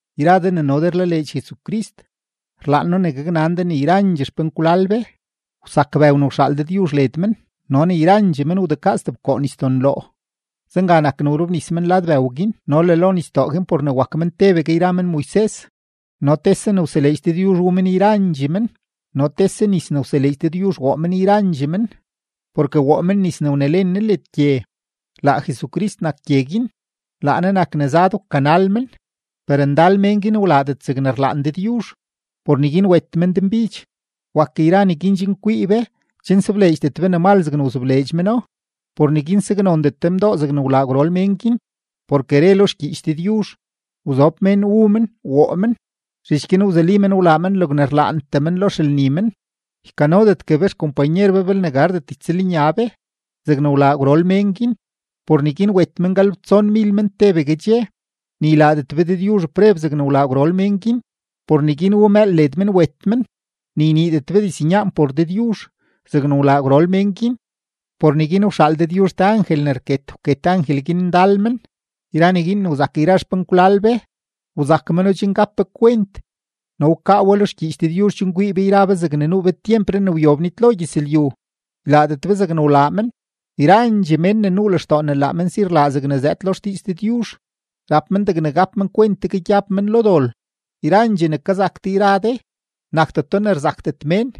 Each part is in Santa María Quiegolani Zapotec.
Yra de ne no de rlaleedx Jesucrist, rlaan noo ne gaknan de ne yrandxee xpenkwlal be, wsak bëw ne wxaal Dëdyuzh led men no ne yrandxee men wdekaa stebkoo nisdo-Nloo. Zenga nak ne wrobnis men lad bëw guin no le lo nisdoo guin por ne wak men tebegue yra men Moises. No tese ne wseleedx Dëdyuzh wu men yrandxee men, no tese nis ne wseleedx Dëdyuzh woo men yrandxee men, porke woo men nis ne wnelen Ne led gye. Laa Jesucrist nak gye guin, laa Ne nak ne zad wkanal men. Per ndal mén guin wlaadet zegne rlaan Dëdyuzh, por neguin wet men denbidx. Wak yra neguin chen kwii be, chen sobleedxdet be ne mal zegne wzobleedx meno. Por neguin saknondet de mdoo zegne wlaa gwrol mén guin, porke re lo xgyiich Dëdyuzh: “Wzob mén wu men, woo men, zhich guin wzuli men wlaa men logne rlaantee men lo xelni men.” Ykanodetgue be xkompanyer be belne gardet ytsëlnya be zegne wlaa gwrol mén guin, por neguin wet men galebtsonmil men tebegue dxe. Ni ylaadet be Dëdyuzh preb zegne wlaa gwrol mén guin, por neguin wu mëël led men wet men. Ni yniidet be diznyaan por Dëdyuzh zegne wlaa gwrol mén guin, por neguin wxaal Dëdyuzh te angel ne rket, wket angel guin ndal men. Yra neguin ne wzak yra xpenkwlal be, wzak meno chen gap be kwent no wkaa we lo xgyiich Dëdyuzh chen kwii be yra be zegne nuu be tyempree ne wyob nitlo gyëzlyu, ylaadet be zegne wlaa men. Yrandxee mén ne nuu lextoo ne laa men si rlaa zegne zëëd lo xdiiz Dëdyuzh, rap men degne gap men kwent tegue gyab men lo dol. Yrandxee ne kazak de yra de, nakdeto ne rzakdet mén.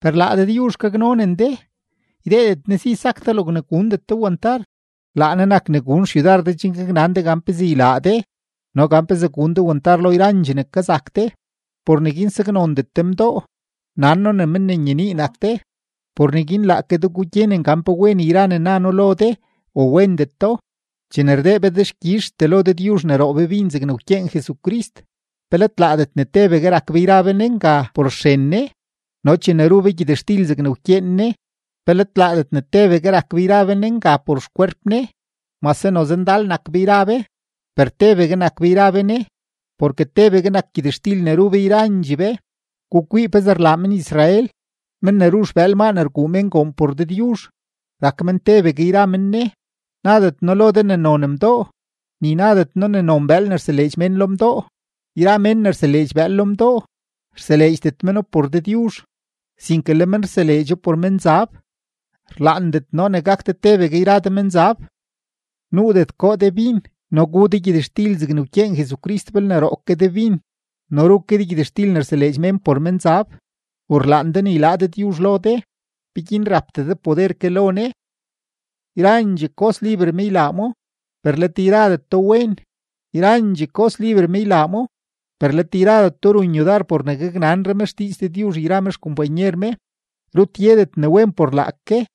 Per laa Dëdyuzh gaknonen de, ydeedet Ne si sak de logne gundet de wantar. Laa Ne nak ne gun xyudar de chen gaknan de gan pezee ylaa de no gan pezee gun de wantar lo yrandxee ne kazak de. Por neguin saknondet de mdoo. Nan noo ne men ne nyenii nak de; por neguin laake de gugyenen gan pe wen yra ne na noo lo de o wendeto. Chene rdee be dexkyizhtee lo Dëdyuzh ne roo be bin zegne wkyeen Jesucrist, ¿pe let laadet ne tebegue rak be yra be Ne nga por xren Ne? No chene ru be gyëtxtil zegne wkyeen Ne, ¿pe let laadet ne tebegue rak be yra be Ne nga por xkwerp Ne? Mase noze ndal nak be yra be, per tebegue nak be yra be Ne, porke tebegue nak gyëtxtil ne ru be yrandxee be. Gukwii pezee rlaa men-Israel; men ne ru xbëël maa ne rguu mén goon por Dëdyuzh, rak men tebegue yra men Ne. Nadet noo lo de ne non mdoo, ni nadet noo ne non bëël ne rseleedx mén lo mdoo. Yra mén ne rseleedx bëël lo mdoo, rseleedxdet meno por Dëdyuzh, sinke le men rseleedxo por menzab; rlaandet noo ne gak de tebegue yra de menzab. Nuudet goo de bin no gu de gyëtxtil zegne wkyeen Jesucrist belne roo ke de bin no ru ke de gyëtxtil ne rseleedx mén por menzab. ¿U rlaan de ne ylaa Dëdyuzh lo de? ¿Peguin rapdee de poder ke lo Ne? Yrandxee kos liber me ylaa mo, per let yradeto wen. Yrandxee kos liber me ylaa mo, per let yradeto run yudar por ne gaknanre me xdiiz Dëdyuzh yra me xkompanyer me. Rut yedet ne wen por laake,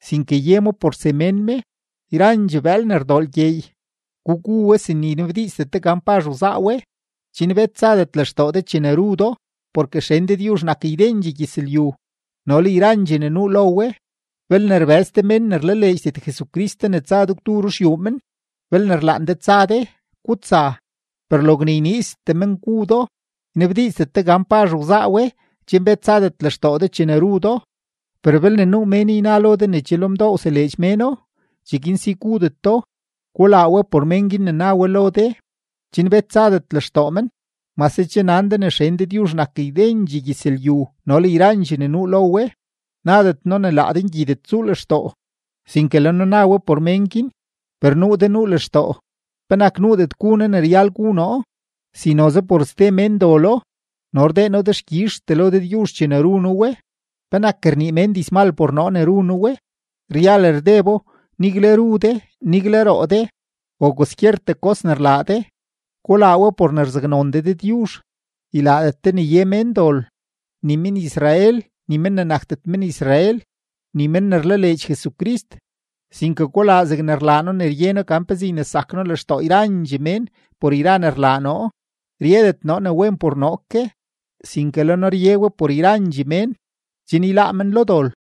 sinke ye mo por semén me. Yrandxee bëël ne rdoo lgyeey, gugu we sin ne ynabdiizdet de gan pazh wzaa we, chen bet tsadet lextoo de chene ru do. Porke xen Dëdyuzh nak ydendxee gyëzlyu no le yrandxee ne nuu lo we. Belne rbëz te mén ne rlaleedxdet Jesucrist de ne tsa de gwdu ru xyuu men, belne rlaan de tsa de, gutsa; per logne yniiztee men gu do, ynabdiizdet de gan pazh wzaa we chen bet tsadet lextoo de chene ru do. Per belne nuu mén yna lo de ne che lo mdoo wseleedx méno, cheguin si gudet do. Gulaa we por mén guin ne na we lo de, chen bet tsadet lextoo men, mase che nan de ne xen Dëdyuzh nak ydendxee gyëzlyu no le yrandxee ne nuu lo we. Nadet noo ne laa de ngyidet tsuu lextoo, sinke le noo na we por mén guin. Per nuu de nuu lextoo: “¿Penak nuudet gu noo ne ryal gu noo, si noze por ste mén dolo? No rdee noo dexkyizhtee lo Dëdyuzh chene ru noo we, ¿penak rnii mén dizmal por noo ne ru noo we?” Ryal rdebo, nigle ru de, nigle roo de, o kwaskyertee kos ne rlaa de, gulaa we por ne rzaknzoon de Dëdyuzh. Ylaadet de ne ye mén dol: ni men-Israel, ni men ne nakdet men-Israel, ni men ne rlaleedx Jesucrist. Sinke gulaa zegne rlaa noo ne rye noo gan pezee ynesak noo lextoo yrandxee mén por yra ne rlaa noo; ryedet noo ne wen por noo ke, sinke le noo rye we por yrandxee mén, chen yláá men lo dol.